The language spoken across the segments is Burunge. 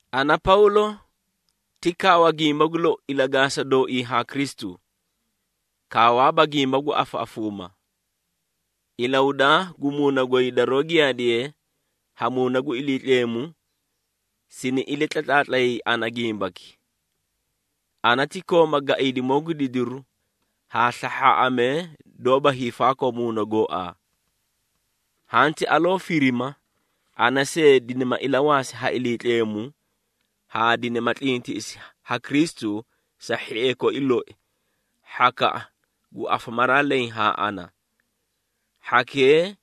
Ana Pawlo, ti kaawa gimba gu lou ilagaasa dooii haa Kristu, kaawaaba gimba gu afaꞌafuuma. Ilahudaa gu muuna goy daroó giyaadiye ha Muuna gu Iliitleemu sini ilatlatlaatlayay ana gimbaki. Ana ti kooma gaiidimoo gu didiri haa slahhaaꞌamee doóba hiifaakoo muuna gooaa. Hanti aloo firima, ana see dinima ilawaasi ha Iliitleemu haa dinima tlintiꞌisi ha Kristu sa hhiee koi loi, hhakaꞌa gu afamaraa leẽ haa ana. Hhakee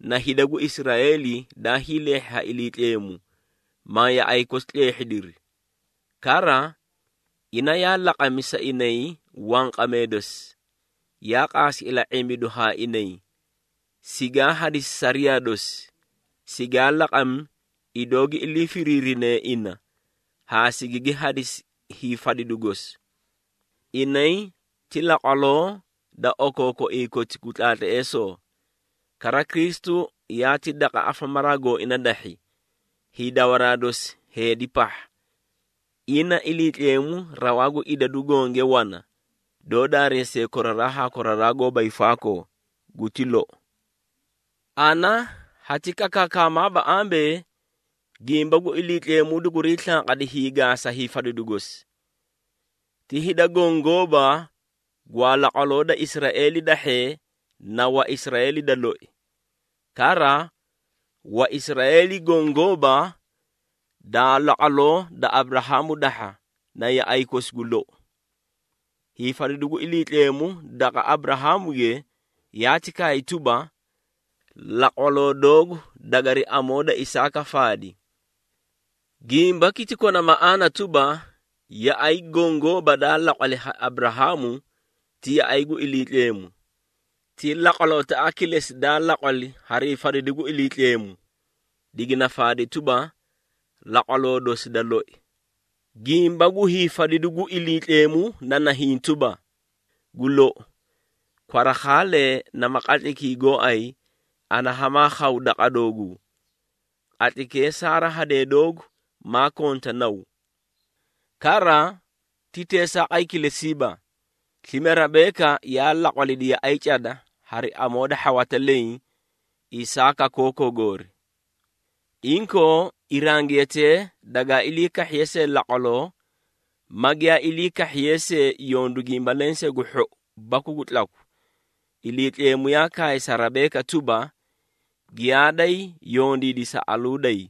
na hida gu Israeeli daa hiileehhi ha Iliitleemu, ma yaꞌay kosi tleehhidiri. Kara, ina yaa laqami sa inay wanqamee dosi, yaa qaasi ila⁄imbidu haa inay, sigaa hadisi sariyaa dosi, sigaa laqami idoo gi ilii firiirinee ina haa sigigi hadisi hiifadidu gosi. Inay ti laqwaloo da okookoiĩ koti gu tlaatleesoo. Kara, Kristu yaati daqa afamaraa gooina dahhi, hiidawaraa dosi heedi pahha. Ina, Iliitleemu rawaa gu idadu gonge wana, doó daareesiye koraraa haa koraraa goóba hiifaakoo. Guti lou. Ana hati kakaakamaaba ambee, gimba gu Iliitleemu duguriĩ slanqadi hiigaasa hiifadidu gosi. Ti hida goõ gooba gwaa laqwaloo da Israeeli dahhee, na Waisraeeli da loi. Kara, Waisraeeli goõ gooba daa laqwaloo da Aburahaamu dahha na yaꞌay kosi gu lou. Hiifadidu gu Iliitleemu daqa Aburahaamuge yaati kaay tuba, “Laqwaloo doogu dagari amoo da Isaaka faadi.” Gimbaki ti kona maꞌaana tuba, yaꞌay goõ gooba daa laqwali ha Aburahaamu, ti yaꞌay gu Iliitleemu. Ti laqwalotaꞌa kilesi daa laqwali harii fadidu gu Iliitleemu, digina faadi tuba, laqwaloo dosi da loi. Gimba gu hiifadidu gu Iliitleemu na nahiĩ tuba, “Gu lou, kwarakhaalee nama qatlaykii gooay ana hamaa khaw daqa dooguu. Qatlaykee Saara hadee doogu maa konta naw.” Kara, ti teesaaqay kilesiiba, slime Rebeeka yaa laqwalidi yaꞌay cada hari amoo da hhawata leẽ, Isaaka kookoo goori. Inkoo, irangiyatee dagaa ilii kahhiye see laqwaloo, ma giyaa ilii kahhiyee see yondu gimba lensee gu hhou baku gu tlaku, Iliitleemu yaa kaay sa Rebeeka tuba, “Giyaaday yondiidi sa aluuday.”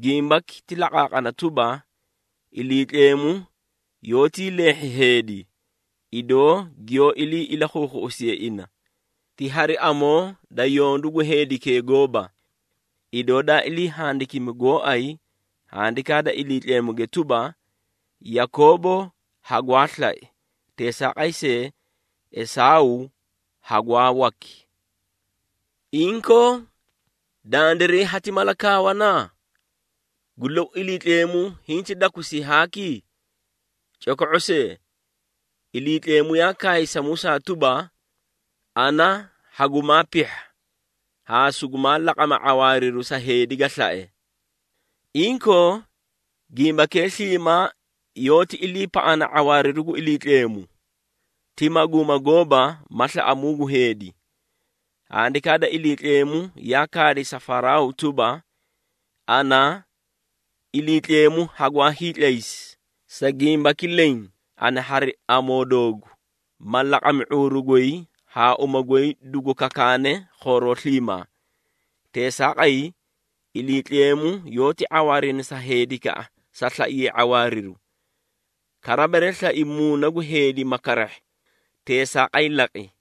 Gimbaki ti laqaaqana tuba, Iliitleemu yoótii leehhi heedi, idoo giyoó ilii ilakhuukhuꞌusiye ina, ti hari amoo da yondu gu heedikee gooba. Idoo daa ilii handikimi gooay Handikaa da Iliitleemuge tuba, “Yakoobo hagwaa slai, teesaaqay see, Esaaw hagwaa waki.” Inkoo, dandiray hati mala kaawana? Gu lou, Iliitleemu hinti dakusii haaki? Coko⁄o see! Iliitleemu yaa kaay sa Musaa tuba, “Ana hagumaa pihha haa sugumaa laqama ⁄awaariru sa heedi ga slae.” Inkoo, gimbakee sliimaa yoóti iliipaꞌana ⁄awaariru gu Iliitleemu, ti maguuma gooba ma slaꞌamuu gu heedi. Handikaa da Iliitleemu yaa kaadi sa Faraaw tuba, “Ana, Iliitleemu hagwaa hiitlaysi, sa gimbaki leẽ, ana hari amoo doogu, ma laqami ⁄uuru goy haa uma goy dugu kakaane khooroo sliimaa.” Teesaaqay, Iliitleemu yoóti ⁄awaarina sa heedikaꞌa sa slaiye ⁄awaariru. Kara, bere slai muuna gu heedi ma karahhi, teesaaqay laqi.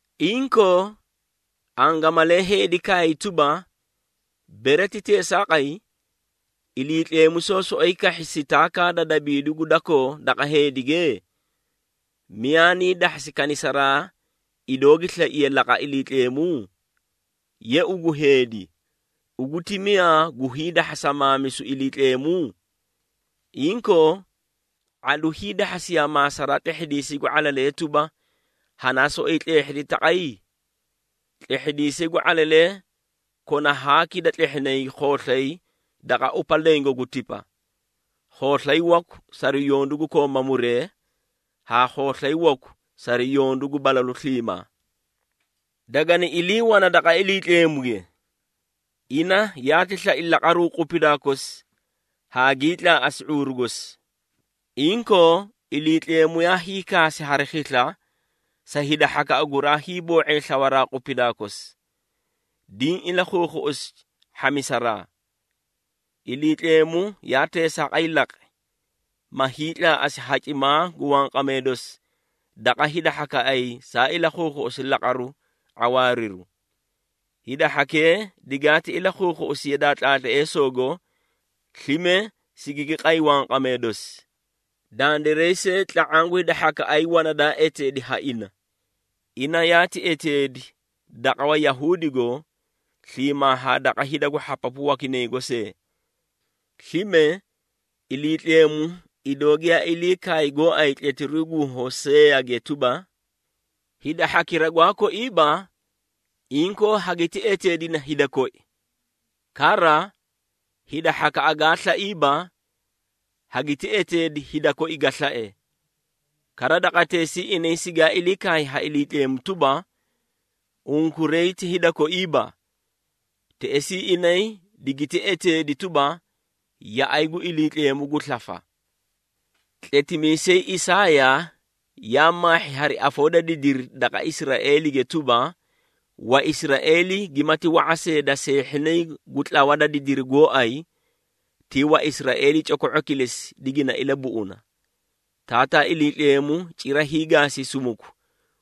Inkoo, angamalee heedi kaay tuba, “Bere ti teesaaqay, Iliitleemu soó soꞌoyi kahhi sitaakaa da dabimidu gu dakoo daqa hidage? Miyaa nii dahhasi kanisaraa idoo gi slaiye laqa Iliitleemu?” Ye ugu heedi, ugu ti miyaa gu hiidahhasa maamisu Iliitleemu? Inkoo, ⁄alu hiidahhasiyaa maasaraa tlehhidiisay gu ⁄alalee tuba, “Hanaa soꞌoyi tleehhidi taqi?” Tlehhidiisay gu ⁄alalee kona haaki da tlehhinay khooslay daqa upa lengo gu tipa, khooslay waku sari yondu gu kooma muree haa khooslay waku sari yondu gu balalu sliimaa. Dagani ilii wana daqa Iliitleemuge. Ina yaati slai laqaruu qupidaa kosi haa gii tlaaꞌasi ⁄uuru gosi. Inkoo, Iliitleemu yaa hiikaasi hari khisla sa hida hhakaꞌa guraa hiiboo⁄ee slawaraa qupidaa kosi, diĩ ilakhuukhuꞌusi hhamisaraa. Iliitleemu yaa teesaaqay laqi, ma hiitlaaꞌasi hacimaa gu wanqamee dosi daqa hida hhakaꞌay saa ilakhuukhuꞌusi laqaru ⁄awaariru. Hida hhakee digaati ilakhuukhuꞌusi yadaa tlaatleesoogo, slime sigigi qay wanqamee dosi. Dandiray see tla⁄aã gu hida hhakaꞌay wana daa eteedi ha ina. Ina yaati eteedi daqa Wayahuudigo, sliimaa haa daqa hida gu hhapapu wakinaygo see. Slime, Iliitleemu idoo giyaa ilii kaay gooay tletiruu gu Hoseeyage tuba, “Hida hhakira gwaa koiiba, inkoo hagiti eteedina ‘Hida koi.’ Kara, hida hhakaꞌa gaa slaiiba, hagiti eteeda ‘Hida koi ga slae.’” “Kara, daqateesii inay sigaa ilii kaay ha Iliitleemu tuba, ‘Unkuray ti hida koiiba,’ teꞌesii inay digiti eteedi tuba, ‘Yaꞌay gu Iliitleemu gu slafa.’” Tletimiisay Isaaya yaa maahhi hari afoo da didiri daqa Israeelige tuba, “Waisraeeli gimati wa⁄a see da seehhinay gu tlawa da didiri gooay, ti Waisraeeli coko⁄o kilesi digina ilabuꞌuna. Taataa Iliitleemu cira hiigaasi sumuku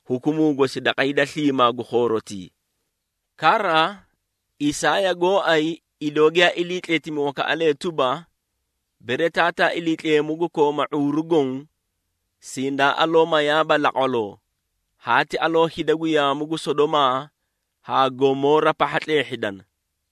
hukumuu gosi daqa hida sliimaa gu khoorotii.” Kara, Isaaya gooay, idoo giyaa ilii tletimi wakaꞌalee tuba, “Bere Taataa Iliitleemu gu kooma ⁄uuru goõ, sindaa aloo mayaaba laqwaloo, haati aloo hida gu yaamu gu Sodomaa haa Gomoora pahha tleehhidana.”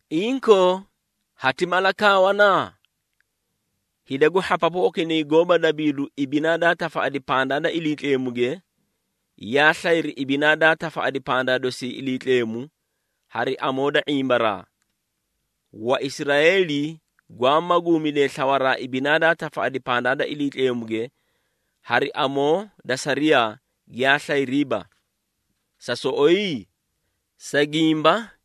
Inkoo, hati mala kaawana? Hida gu hhapapu wakinay goóba dabiidu ibinaa daa tafaꞌadi pandaa da Iliitleemuge, yaa slayri ibinaa daa tafaꞌadi pandaa dosi Iliitleemu hari amoo da ⁄imbaraa. Waisraeeli gwaa maguumidee slawaraa ibinaa daa tafaꞌadi pandaa da Iliitleemuge hari amoo da sariyaa, giyaa slayriiba. Sa soꞌoyi? Sa gimba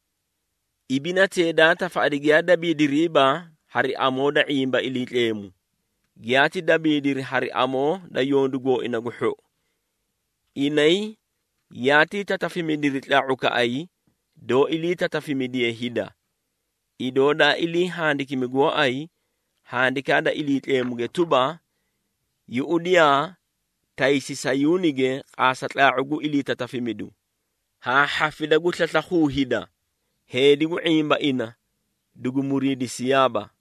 ibinatee daa tafaꞌadi giyaa dabiidiriiba hari amoo da ⁄imba Iliitleemu, giyaati dabiidiri hari amoo da yondu gooina gu hhou. Inay yaatii tatafimidiri tlaa⁄ukaꞌay, doó ilii tatafimidiye hida. Idoo daa ilii handikimi gooay Handikaa da Iliitleemu tuba, “Yuꞌudiyaa, taysi Sayuunige qaasa tlaa⁄u gu iliitatafimidu, haa hhafida gu slaslakhuu hida, heedi gu ⁄imba ina dugu muriidisiyaaba.”